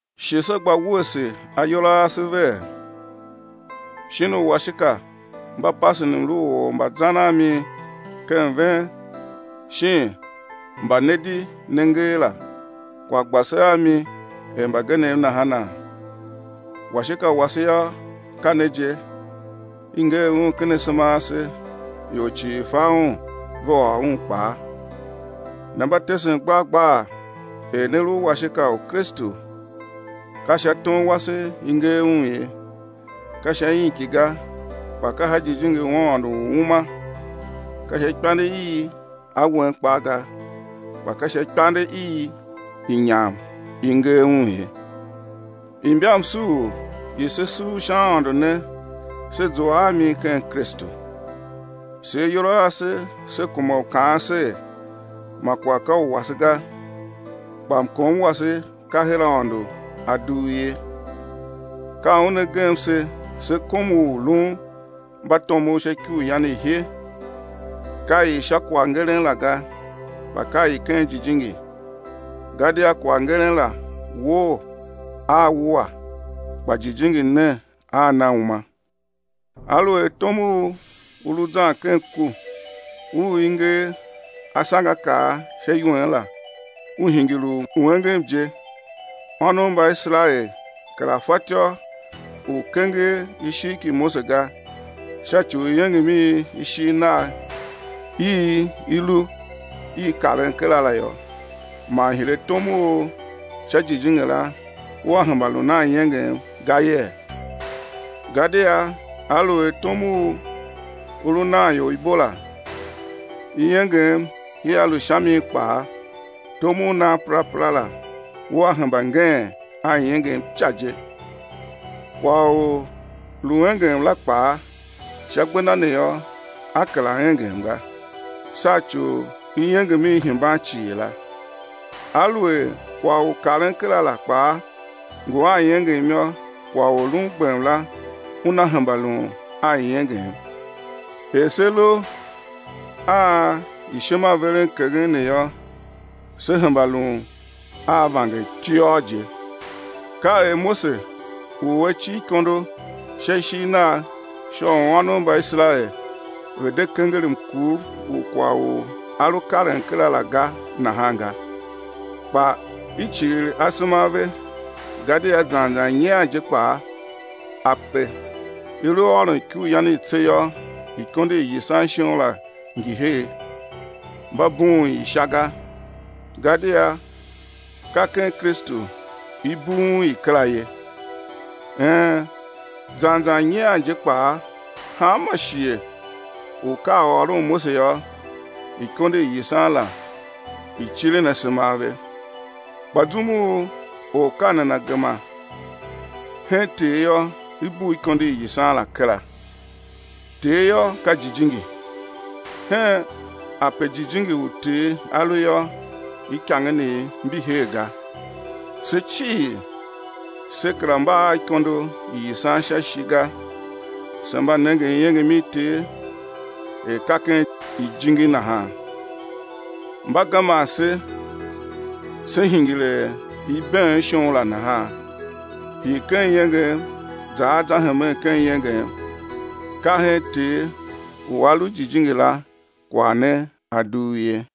Shi se gba wuese ayol a ase vee? Shin uwashika mba pasen mlu u or mba zan a mi ken ven shin mba ne di ne nger la, kwagh gba se a mi er mbagenev nahana? Washika wase yô, ka ne je, i nger un ken asema ase, ior cii fa un ve ôr un kpaa. Ne mba tesen gbar gbar er ne lu washika u Kristu, ka sha tom wase i nger un ye, ka sha inki ga kpa ka sha Jijingi u Aôndo u uma, ka sha ikpande i awen kpaa ga, kpa ka sha ikpande i inyam i nger un ye. Imbamsuur i se suur sha Aôndo ne se zua a mi ken Kristu. Se ayol a ase se kuma u kaan ser ma kwagh ka u wase ga, kpa mkom wase ka her Aôndo a dugh ye. Ka Un A gem se se kom u lun mbatomov sha ikuryan i he, ka i sha kwaghngeren la ga kpa ka i ken jijingi, gadia kwaghngeren la woo a wua kpa jijingi ne a na uma. Aluer tom u u lu zan ken ku, u i nger asangeakaa sha iwen la, u hingir u engem je, ônov mba Iserael kera fatyô u kenger ishigh ki Mose ga sha ci u iengem i ishigh nagh i i lu i karen kera la yô, man hire tom u sha jijingi la ua hemba lun a iengem ga yee? Gadia aluer tom u u lu nan ior ibo la, iengem ia lu sha mi kpaa, tom u nan perapera la ua hemba ngeen a iengem ica je. Kwagh u lu iengem la kpaa, sha gbenda ne yô a kera engem ga, sha ci u iengem i hemban cii la. Aluer kwagh u karen kera la kpaa ngu a iengem yô, kwagh u lun gbem la una hemba lun a iengem. Er se lu a imbaishimaverenkeghen ne yô, se hemba lun a vangertiôr je. Ka er Mose u a cir ikondo sha ishigh nagh sha u ônov mba Iserael ve̱ de kenger mkur u kwagh u a lu karen kera la ga nahan ga. Kpa i cighir asema a ve, gadia zan zan nyian je kpaa ape i lu ôron Ikuryan i Tse yô, ikondo i yisan shon la ngi her, mba bughun i sha ga, gadia ka ken Kristu i bughun i kera ye. Een, zan zan nyian je kpaa hanma shighe u ka a ôron Mose yô, ikondo i yisan la i cirin asema a ve. Kpa zum u or ka nana gema hen Ter yô, i bugh ikondo i yisan la kera. Ter yô ka Jijingi, hen ape Jijingi u Ter A lu yô, ikangenev mbi her ga. Se cii se kera mba a ikondo i yisan sha ishi ga se mba nengen iengem i Ter er ka ken ijingi nahan. Mba geman se se̱ hingir er ibeen shon la nahan, hii ken iengem za a za hemen ken iengem. Ka hen Ter u A lu Jijingi la kwagh ne a dugh ye.